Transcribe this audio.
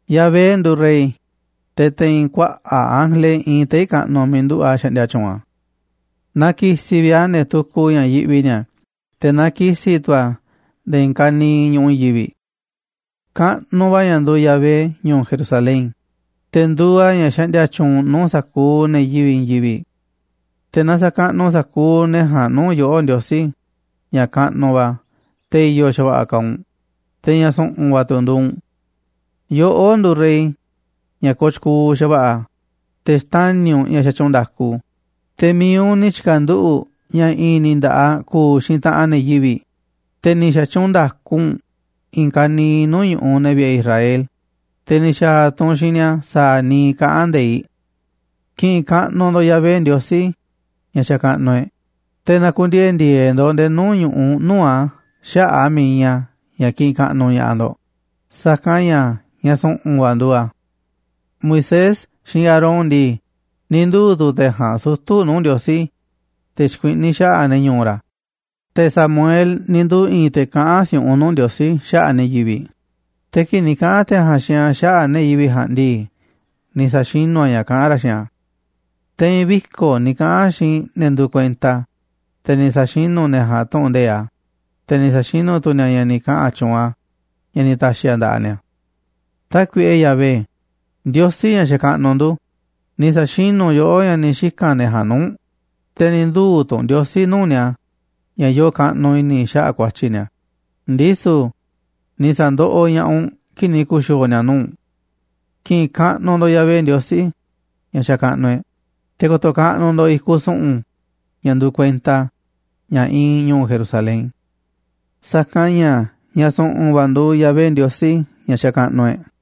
Yahvé nduuꞌ rey, te̱ te̱i̱n kuaꞌa̱ꞌ ángele iinꞌ tei̱ kaꞌnuꞌ miiꞌ nduꞌu̱ꞌ a̱ xaꞌndia tyuunꞌ a̱. Na ki̱si̱ vi̱ꞌ a̱ ne̱ tukuꞌ ña̱ yiꞌvi ni̱a̱, te̱ na ki̱si̱ tu̱ a̱ nde̱e̱ i̱i̱n ka̱niiꞌ ñu̱ꞌuꞌ i̱i̱n yivi̱ꞌ. Kaꞌnuꞌ va̱ ña̱ nduuꞌ Yahvé ñu̱u̱ Jerusalén, te̱ nduuꞌ a̱ ña̱ xaꞌndia tyuunꞌ nuu̱ꞌ sa̱kuuꞌ ne̱ yivi̱ꞌ i̱i̱n yivi̱ꞌ. Te̱ na sa̱kaꞌnuꞌ sa̱kuuꞌ ne̱ ja̱a̱nꞌ nuu̱ꞌ yoꞌó, Ndiosí, ña̱ kaꞌnuꞌ va̱, te̱ i̱yo̱ xa̱va̱ꞌa̱ kaaꞌ u̱nꞌ, te̱ ña̱ su̱ꞌu̱n va̱ tu̱ nduuꞌ u̱nꞌ. Yoꞌó nduuꞌ Rey ña̱ kooꞌ tyukuuꞌ xa̱va̱ꞌa̱, te̱ xtani̱ u̱nꞌ ña̱ xatyuunꞌ nda̱ku, te̱ mi̱iꞌ u̱nꞌ ni̱ tyi̱ka̱nduꞌu̱ꞌ ña̱ i̱i̱n ni̱ nda̱ꞌaꞌ ku̱u̱ xiinꞌ taꞌanꞌ ne̱ yivi̱ꞌ, te̱ ni̱ xa̱tyuunꞌ nda̱ku u̱nꞌ i̱i̱n ka̱niiꞌ nuu̱ꞌ ñu̱ꞌuꞌ ne̱ vi̱ꞌe̱ Israel, te̱ ni̱ xa̱a̱ tu̱ u̱nꞌ xiinꞌ ni̱a̱ sa̱a̱ niiꞌ kaꞌán nde̱iꞌ. Ki̱ꞌi̱n kaꞌnuꞌ ndo̱ꞌ Yahvé Ndiosí ña̱ xakaꞌnuꞌ e̱ꞌ, te̱ na̱ku̱ndiee̱ ndi̱e̱e̱ ndo̱ꞌ nde̱e̱ nuu̱ꞌ ñu̱ꞌuꞌ nuu̱ꞌ a̱ xaꞌa̱ꞌ a̱ miiꞌ iinꞌ a̱ ña̱ kiꞌinꞌ kaꞌnuꞌ ña̱ꞌaꞌ ndo̱ꞌ, sa̱kanꞌ ña̱ ña̱ su̱ꞌu̱n va̱ nduuꞌ a̱. Moisés xiinꞌ Aarón ndii, ni̱ nduu̱ tu̱ te̱ ja̱a̱nꞌ sutu̱ nuu̱ꞌ Ndiosí, te̱ xikuiꞌní xaꞌa̱ꞌ ne̱ ñu̱u̱ ra̱, te̱ Samuel ni̱ nduu̱ i̱i̱n te̱ kaꞌán si̱u̱ꞌunꞌ nuu̱ꞌ Ndiosí xaꞌa̱ꞌ ne̱ yivi̱ꞌ, te̱ kii̱ꞌ ni̱ kaꞌa̱n te̱ ja̱a̱nꞌ xiinꞌ a̱ xaꞌa̱ꞌ ne̱ yivi̱ꞌ ja̱a̱nꞌ ndii, ni̱ sa̱xinú a̱ ña̱ kaꞌán ra̱ xiinꞌ a̱. Te̱i̱n viko̱ꞌ ni̱ kaꞌa̱n a̱ xiinꞌ ne̱ nduuꞌ kuenta a̱, te̱ ni̱ sa̱xinú ne̱ ja̱a̱nꞌ tu̱ꞌu̱n nde̱iꞌ a̱, te̱ ni̱ sa̱xinú tu̱ ni̱a̱ ña̱ ni̱ kaꞌa̱n tyuunꞌ a̱, ña̱ ni̱ ta̱xi̱ a̱ nda̱ꞌaꞌ ni̱a̱. Tákuiꞌe Yahvé, Ndiosí, ña̱ xakaꞌnuꞌ ndu̱, ni̱ sa̱xinú yoꞌó ña̱ ni̱ xika̱n ne̱ ja̱a̱nꞌ nuu̱ꞌ u̱nꞌ, te̱ ni̱ nduu̱ tu̱ u̱nꞌ Ndiosí nuu̱ꞌ ni̱a̱ ña̱ yoo kaꞌnuꞌ i̱ni̱ xaꞌa̱ꞌ ku̱a̱tyi̱ ni̱a̱, ndisu̱ ni̱ sa̱ndoꞌoꞌ ña̱ꞌaꞌ u̱nꞌ kii̱ꞌ ni̱ ku̱xi̱o̱o̱ ni̱a̱ nuu̱ꞌ u̱nꞌ. Ki̱ꞌi̱n kaꞌnuꞌ ndo̱ꞌ Yahvé Ndiosí ña̱ xakaꞌnuꞌ e̱ꞌ, te̱ ko̱to̱ kaꞌnuꞌ ndo̱ꞌ a̱ i̱kuꞌ su̱ꞌu̱n ña̱ nduuꞌ kuenta a̱, ña̱ iinꞌ ñu̱u̱ Jerusalén, sa̱kanꞌ ña̱ ña̱ su̱ꞌu̱n va̱ nduuꞌ Yahvé Ndiosí ña̱ xakaꞌnuꞌ e̱ꞌ.